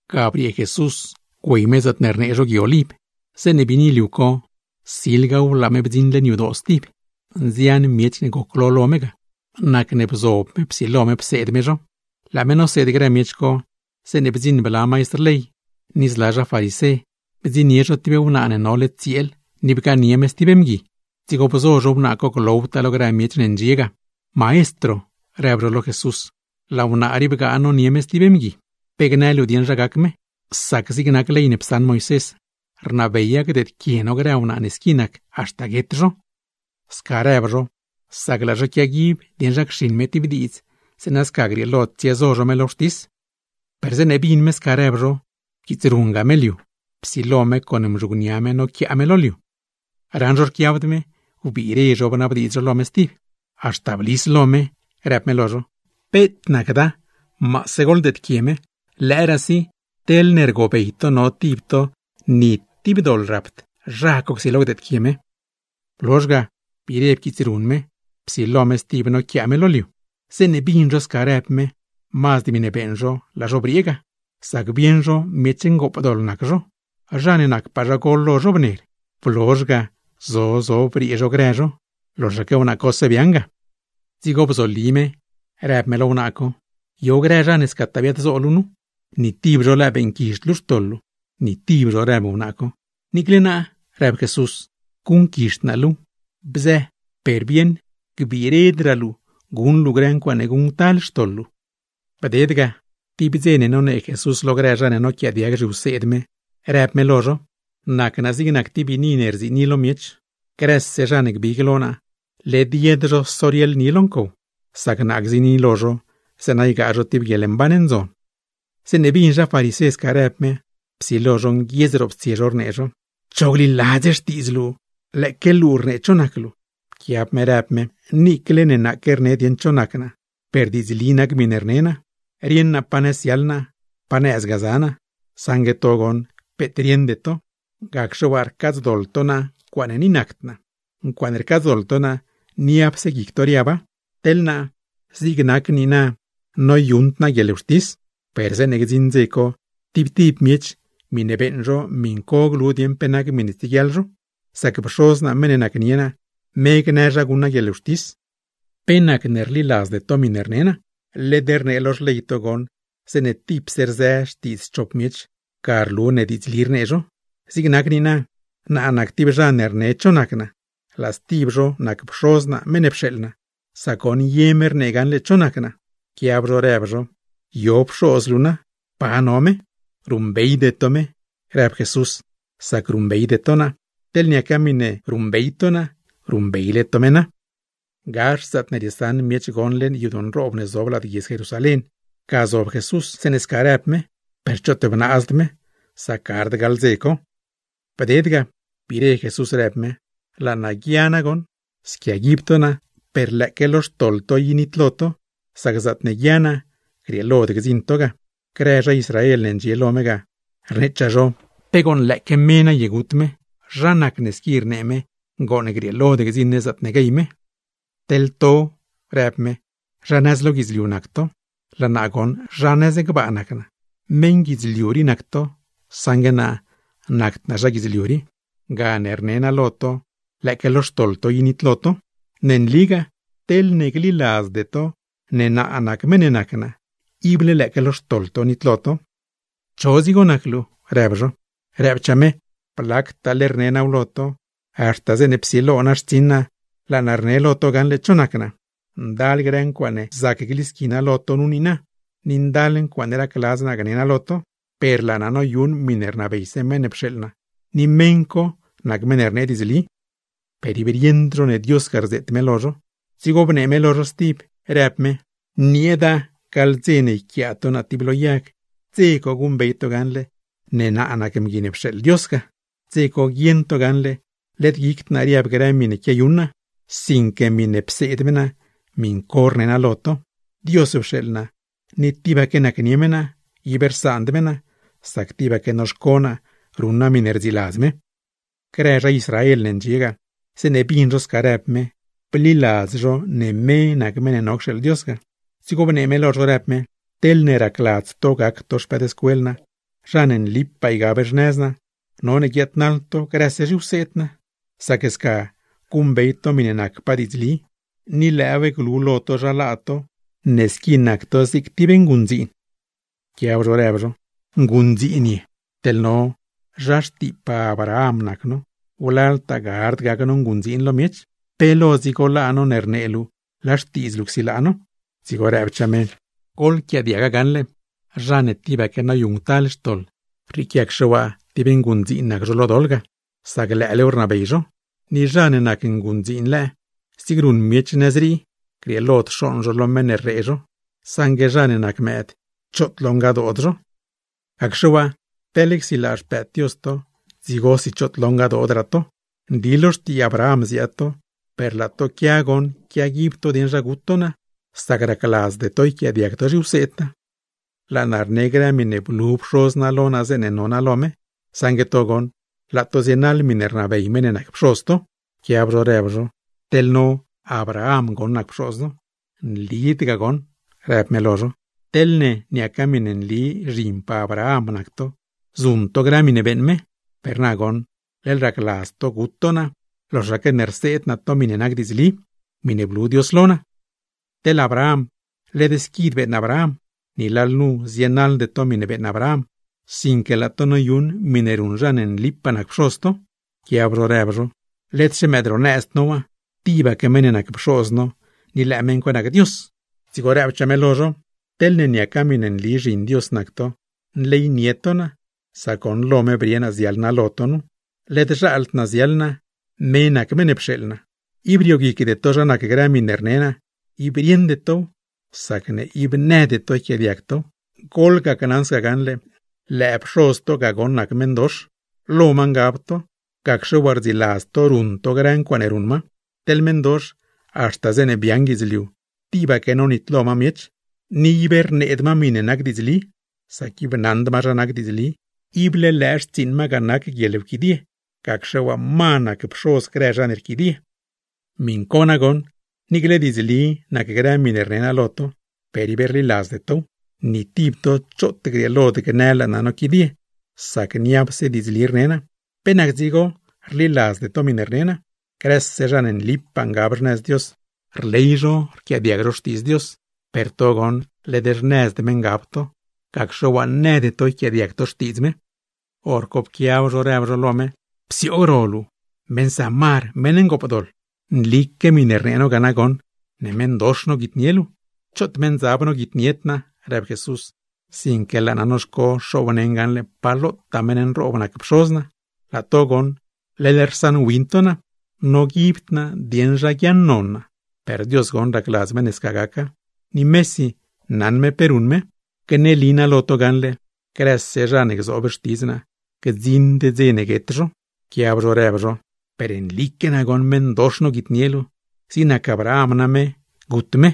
Ga briee Jesús güey me zaatne rnee zho Gui Oliv. Zeeṉe biini liu co, silgaw laa me bdziṉ leṉ yadoo co stib. Nzian miech ne goclo lo me ga, nacne bzob me psilo me pseed me zho. Laa me noseed grë miech co, zeeṉe bdziṉ bla maistr ley, ni zla zha farisé, bdziṉnie zho tib wnaa ne nole tsieel ni bgaanie me stib mgui; dzigo bzo zho wnaa co glowtaa lo grë miech ne ndxie ga. ―Maestro ―rëb zho lo Jesús―, laa wnaa rii bgaa nonie me stib mgui. ¿Pe gnë luu dieṉ zha gac me? Sac zig nac ley ne psaṉ Moisés, rnabeya gdeedquie no grë wnaa ne squi nac, haxta guet zho. Sca rëb zho, sac laa zho quiaguib dieṉ zha cxiṉ me tib diidz, zeeṉa sca grieelo tsiezo zho me lo wxtis. Per zeeṉe bin me sca rëb zho pquiitsrunga me liu, psilo me con mzhugnia me noquiaa me lo liu. Raṉ zho rquiabd me, wbiire zho bnabdiidz zho lo me stib; haxta blis lo me, rëb me lo zho: ―Peet nacda, goḻdeedquie me. ¡Lëëraasi, zha ne rieṉ ni tib doḻ rapd, zha co csilo gdeedquie me! Blozh ga biire pquiitsrun me, psilo me stib noquiaa me lo liu. Zeeṉe bin zho sca rëb me, mazd miṉe beeṉ zho laa zho briee ga, sac bieṉ zho miech ngoopdoḻ nac zho. Zha ne nacpaa zha gol lo zho bner, blozh ga zo zo briee zho grë zho; loxaque wnaa cose biaaṉ ga. Dzigo bzoli me, rëb me lo wnaa co: ―¿Yo grë zha ne scataa biaad-zo luu nu? ¿Ni tib zho lëë beeṉquizhd luu xtoḻ luu? ―Ni tib zho ―rëb wnaa co. ―Niicle naa ―rëb Jesús―, guṉquizhd naa luu xtoḻ luu. Bzë, per bieṉ gbiiredraa luu guṉ luu grë ncuaaṉe guṉctal xtoḻ luu. Bded ga, tib dze nonee Jesús lo grë zha ne noquiaadiag zhiwseed me, rëb me lo zho: ―Nac naa zig nac tib biini ne rziini lo miech. Grëse zha ne gbig lo naa, led yed zho sorieḻ ni lo ncow, sac naa gziini lo zho zeeṉa ygaa zho tib guieḻmban ndzon. Zeeṉe bin zha farisé sca rëb me, psilo zho nguiedz roptsie zho rnee zho: ―¡Cho gliladz xtiidz luu! ¡Lëëque luu rnee cho nac luu! Pquiab me rëb me: ―Niicle ne naaque rne dieṉ cho nac naa, per diidzli nac miṉe rne naa. Rieṉ naa pa nëz ziaḻ naa, pa nëzgaa za naa; saṉgue to goṉ peet rieṉde to, gacxe waa, rcaadzdoḻ to naa ncuaaṉe ni nacd naa; ncuaaṉe rcaadzdoḻ to naa, niapse guic to riaba. Teḻ naa, zig nac niina noyuṉd naa guieḻwxtis per zeeṉe gdziṉ dze co, tib tib miech miṉe beeṉ zho miṉ co glu dieṉ pe nac miṉe tsieguiaḻ zho; sac Pxoz naa meṉ ne nacnie naa, me gnë zha guṉ naa guieḻwxtis. ¿Pe nacne rliladzde to miṉe rne naa? Led rnee lo xley to zeeṉe tipse rzë xtiidz chop miech, ga rlu ne diidzli rnee zho. Zig nac niina, naa nac tib zha ne rne cho nac naa, laa stib zho nac Pxoz naa meṉ ne pxeeḻ naa; sac goṉ ye me rnee gaṉle cho nac naa. Pquiab zho rëb zho: ―¿Yo Pxoz luu na? ¿Pa no me? ―Ruṉbeyde to me ―rëb Jesús―, sac niicle naa ruṉbeyde to naa. Teḻne niaca miṉe ruṉbey to naa, ruṉbeyle to me na. Gax zaatne riesaṉ miech gon leṉ yadoo nroob ne zob lad guiedz Jerusalén, ga zob Jesús zeeṉe sca rëb me; per choot bnaazd me, sac gard gaḻ dze co. Bded ga, biire Jesús rëb me: ―Laa naa guia nagoṉ. Squiaguib to naa, per lëëque lo xtoḻ to i nitlo to, sac zaatne guia naa grieelod gdziṉ to ga. Grë zha Israel ne ndxie lo me ga, rneechaa zho: ―¿Pe gooṉ lëëque me naye gut me? Zha nacne squi rnee me gooṉ grieelod gdziṉ ne zaatne guey me. ―Teḻ to ―rëb me―, zha nëz lo guidzliu nac to; laa naa goṉ zha nëz gbaa nac naa. Meṉ guidzliu rii nac to, saṉgue naa nacd naa zha guidzliu rii. Gane ni naa lo to lëëque lo xtoḻ to i nitlo to. Ne nligaa, teḻne gliladzde to ne naa nac meṉ ne nac naa, ible lëëque lo xtoḻ to nitlo to. ―¿Cho dzigo nac luu? ―rëb zho. Rëbchaa me: ―Blactaale rne naaw lo to. Haxta zeeṉe psilo naa xtsiṉ naa, laa naa rne lo to gaṉle cho nac naa. Ndal grë ncuaaṉe zac glisqui naa lo to nu niina, ni ndal ncuaaṉe racladz naa gne naa lo to, per laa naa noyuṉ miṉe rnabeyse meṉ ne pxeeḻ naa; ni meṉ co nac meṉ ne rnee diidzli. Per ib rieṉd zho ne Dios ga rzeet me lo zho. Dzigo bnee me lo zho stib, rëb me: ―Nieeda gaḻ dze ne yquiaa to naa tib lo yag, dze co guṉbey to gaṉle ne naa nac Mgui ne pxeeḻ Dios ga, dze co guieṉ to gaṉle led guicd naa riab grë miṉe quiayuṉ naa; sinque miṉe pseed me naa, miṉ co rne naa lo to. Dios pxeeḻ naa ni tibaque nacnie me naa, ib rsaand me naa, sac tibaque noxco naa ruṉ naa miṉe rdziladz me. Grë zha Israel ne ndxie ga, zeeṉe bin zho sca rëb me, bliladz zho ne me nac meṉ ne no cxeeḻ Dios ga. Dzigo bnee me lo zho, rëb me: ―Teḻne racladz to gac to xpëëdscuel naa, zha ne nlipaa ygab xnëz naa, none guiaadnaḻ to grëse zhiwseed naa. Sac sca guṉbey to miṉe nacpaa diidzli, ni lëëw glu lo to zha laa to ne squi nac to zig tib nguṉdziin. Pquiab zho rëb zho: ―¡Nguṉdziin ye! ¡Teḻ no, zha xtiipaa Abraham nac no, wlaltaa gard gac no nguṉdziin lo miech! ¿Pe lo dzigo laa no, ne rnee luu laa xtiidz luu csilaa no? Dzigo rëbchaa me: ―Goḻquiaadiaga gaṉle: zha ne tibaque noyuṉctal xtoḻ, rrieequiacxe waa tib nguṉdziin nac zho lo doḻ ga, sac lëëlew rnabey zho. Ni zha ne nac nguṉdziin lëë, zig ruṉ miech nëz rii, grieelod xooṉ zho lo meṉ ne rree zho; saṉgue zha ne nac mëëd, choot lo ngadood zho. Gacxe waa, teḻ csilaa Xpëëd Dios to, dzigosi choot lo ngadoodraa to. Nli lo xtii Abraham ziaad to; per laa to quia goṉ quiaguib to dieṉ zha gut to naa, sac racladzde to yquiaadiag to zhiwseed naa. Laa naa rne grë miṉe blu Pxoz naa lo naa, zeeṉe no naa lo me; saṉgue to goṉ, laa to zienaḻ miṉe rnabey meṉ ne nac pxoz to. Pquiab zho rëb zho: ―¡Ni Abraham goṉ nac pxoz no! ―¡Nlid ga nagoṉ! ―rëb me lo zho―. Teḻne niaca miṉe nli zhinpaa Abraham nac to, zuṉ to grë miṉe beeṉ me. Per na goṉ leḻ racladz to gut to naa, loxaque ne rseed naa to miṉe nac diidzli, miṉe blu Dios lo naa. ¡Teḻ Abraham led squid beeṉ Abraham! Ni lalnu zienaḻde to miṉe beeṉ Abraham, sinque laa to noyuṉ miṉe ruṉ zha ne nlipaa nac pxoz to. Pquiab zho rëb zho: ―¡Led-xe mëëd ro nëzd no waa! Tibaque meṉ ne nac pxoz no, ni lëë meṉ co nac Dios. Dzigo rëbchaa me lo zho: ―Teḻne niaca miṉe nli zhin Dios nac to, nleynie to naa, sac goṉ lo me brie naa ziaḻ naa lo to nu. Led zhaald naa ziaḻ naa, me nac meṉ ne pxeeḻ naa. Ib rioguicde to zha nac grë miṉe rne naa, ib rieṉde tow, sacne ib nëde to yquiaadiag tow. Goḻgacnaṉ sca gaṉle, lëë pxoz to ga goṉ nac meṉdox, lo ma ngab to, gacxe waa rdziladz to ruṉ to grë ncuaaṉe ruṉ ma. Teḻ meṉdox, haxta zeeṉe biaaṉ guidzliu tibaque nonitlo ma miech, ni ib rneed ma miṉe nac diidzli, sac ib naṉd ma zha nac diidzli. Ible lëë xtsiiṉ ma ga nac guieḻwquidie, gacxe waa ma nac pxoz zha ne rquidie. ¡Miṉ co nagoṉ, niicle diidzli nac grë miṉe rne naa lo to, per ib rliladzde tow! Ni tib to choot grieelod gnë laa naa noquidie, sac niapse diidzli rne naa. ¿Pe nac dzigo rliladzde to miṉe rne naa? Grëse zha ne nlipaa ngab xnëz Dios, rley zho rquiaadiag zho xtiidz Dios; per to goṉ led xnëzd me ngab to, gacxe waa nëde to yquiaadiag tow. Horco pquiab zho rëb zho lo me: ―¡Psioog ro luu meṉ Samar ngoopdoḻ! ¡Nlique miṉe rnee no ga nagoṉ, ne meṉdox noguitnie luu! ―Choot meṉdzab noguitnied naa ―rëb Jesús―, sinque laa naa noxco xoobneṉ gaṉle pa lotaa meṉ nroob nac Pxoz naa; laa to goṉ leḻ rsaṉwin to naa. Noguibd naa dieṉ zha guiaaṉnon naa, per Dios goṉ racladz me ne sca gaca; ni mesi naṉ me pe ruṉ me. Gneli naa lo to gaṉle: ¡Grëse zha ne gzoob xtidz naa, gdziṉd dze ne guet zho! Pquiab zho rëb zho: ―¡Per nlique nagoṉ meṉdox noguitnie luu! Zig nac Abraham name gut me,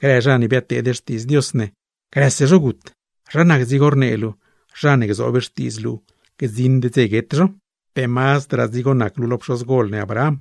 grë zha ne biadteed xtiidz Dios ne, grëse zho gut zho. ¿Zha nac dzigo rnee luu, zha ne gzoob xtiidz luu, gdziṉd dze guet zho? ¿Pe mazdraa dzigo nac luu lo pxozgol ne Abraham,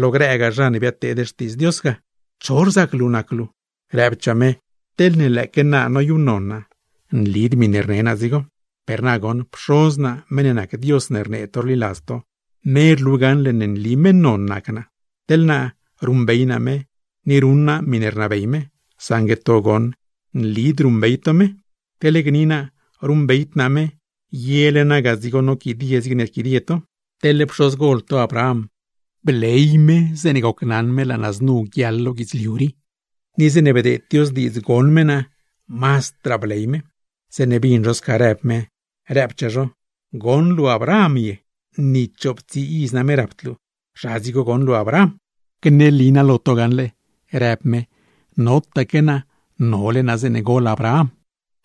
lo grëgaa zha ne biadteed xtiidz Dios ga? ¿Cho rzac luu nac luu? Rëbchaa me: ―Teḻne lëëque naa noyuṉnon naa, nlid miṉe rne naa dzigo. Per na goṉ, Pxoz naa, meṉ ne nac Dios ne rnee to rliladz to, me rlu gaṉle ne nli meṉ non nac naa. Teḻ naa ruṉbey naa me, ni ruṉ naa miṉe rnabey me; saṉgue to goṉ, nlid ruṉbey to me. Teḻ gni naa ruṉbeyd naa me, yele naa ga dzigo noquidie zigne rquidie to. Pxozgol to Abraham, bley me zeeṉe gocnaṉ me laa naa znu guiaḻ lo guidzliu rii. Ni zeeṉe bdeed Dios diidz goṉ me naa, mazdraa bley me. Zeeṉe bin zho sca rëb me, rëbchaa zho: ―¿Goṉ luu Abraham ye? ¡Ni chooptsii iz name rapd luu! ¡Zha dzigo goṉ luu Abraham! ―Gneli naa lo to gaṉle ―rëb me―, notaque naa; nole naa zeeṉe gol Abraham.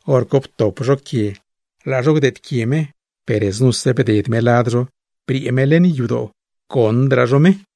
Horco ptop zho quie laa zho gdeedquie me, per znuse bded me lad zho briee me leṉ yadoo, goṉdraa zho me.